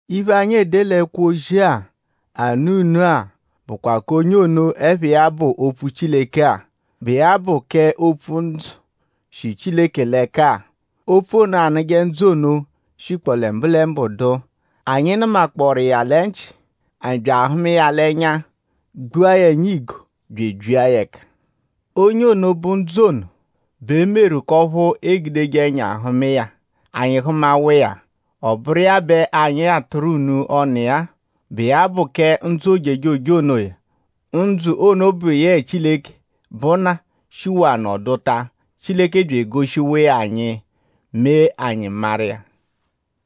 Iphe, anyi ede l'ẹkwo-ozi-a anụ unu-a bụkwa k'onye ono, ẹpha iya bụ Opfu Chileke-a, bụ iya bụ kẹ Opfu, bụ ndzụ, shi Chileke l'ẹka-a. Opfu ono, anụje ndzụ ono shikpọ lẹ mbụlembu dụ. Anyi nụmakpooru iya lẹ nchị; bya ahụma iya l'ẹnya; gbua ya ẹnya igo; bya ebyia ya ẹka. Onye ono, bụ ndzụ ono bẹ e meru k'ọphu eegudeje ẹnya hụma iya; anyi hụmawa iya. Ọ bụru iya bẹ anyi atụru unu ọnu iya-a, bụ iya bụ kẹ ndzụ ojejoje onoya. Ndzụ ono bụ yẹe Chileke, bụ Nna shihawaa nọduta. Chileke bya egoshiwa iya anyi; mee anyi maru iya.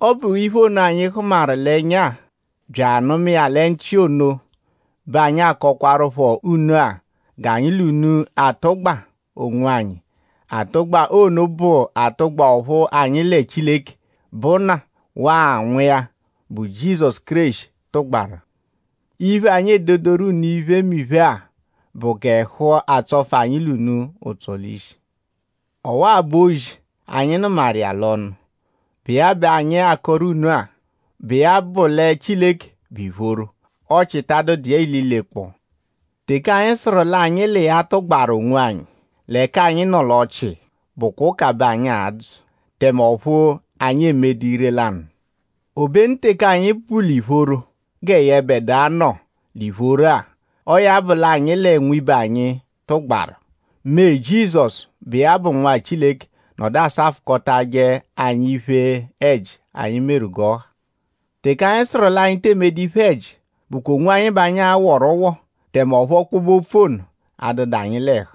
Ọ bụ iphe ono, anyi hụmaru l'ẹnya bya anụma lẹ nchị ono bẹ anyi akọkwarupho unu-a g'anyi l'unu atụgbabe onwanyi. Atụgba ono bụ atụgba ọphu anyi lẹ Chileke, bụ Nna waa Nwa iya, bụ Jizọsu Kéreshi tụgbaru. Iphe, anyi ededoru unu iphemiphe-a bụ g'ẹhu atsọfu anyi l'unu ụtso l'ishi. Ọwa-a bụ ozi, anyi nụmaru iya l'ọnu; bụ iya bẹ anyi akọru unu-a, bụ iya bụ lẹ Chileke bụ ìphóró; ọchii ta adụdu iya ililekpọo. Teke anyi sụru l'anyi l'iya tụgbaru onwanyi; l'ẹka anyi nọ l'ọchii; bụkwa ụka bẹ anyi adzụ; tẹme ọphu anyi emedu ire-lanụ. Obenu teke anyi bu l'ìphóró gẹ yẹbedua nọ l'ìphóró-a; ọo ya bụ l'anyi lẹ nwibe anyi tụgbaru; mee Jizọsu, bụ iya bụ Nwa Chileke nọdu asafụkotaje anyi iphe-ẹji, anyi meru g'ọ ha. Teke anyi sụru l'anyi te emedu iphe-ẹji bụkwa onwanyi bẹ anyi aghọru ụgho; tẹme ọphu ọkpobe-opfu ono adụdu anyi l'ẹhu.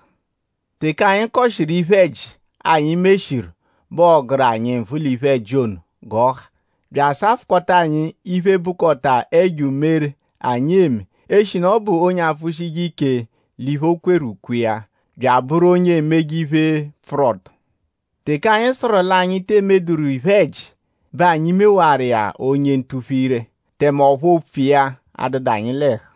Teke anyi kọshiru iphe-ẹji, anyi meshiru b'ọo-gụru anyi nvụ l'iphe-ẹji ono g'ọ ha; bya asafụkota anyi iphe, bụkota ẹjo umere, anyi eme; eshinu ọ bụ onye apfụshije ike l'iphe, o kweru ukwe iya; bya abụru onye emeje iphe, pfụru ọto. Teke anyi sụru l'anyi te emeduru iphe-ẹji bẹ anyi mewaru iya onye ntuphu-ire; tẹme ọphu opfu iya adụdu anyi l'ẹhu.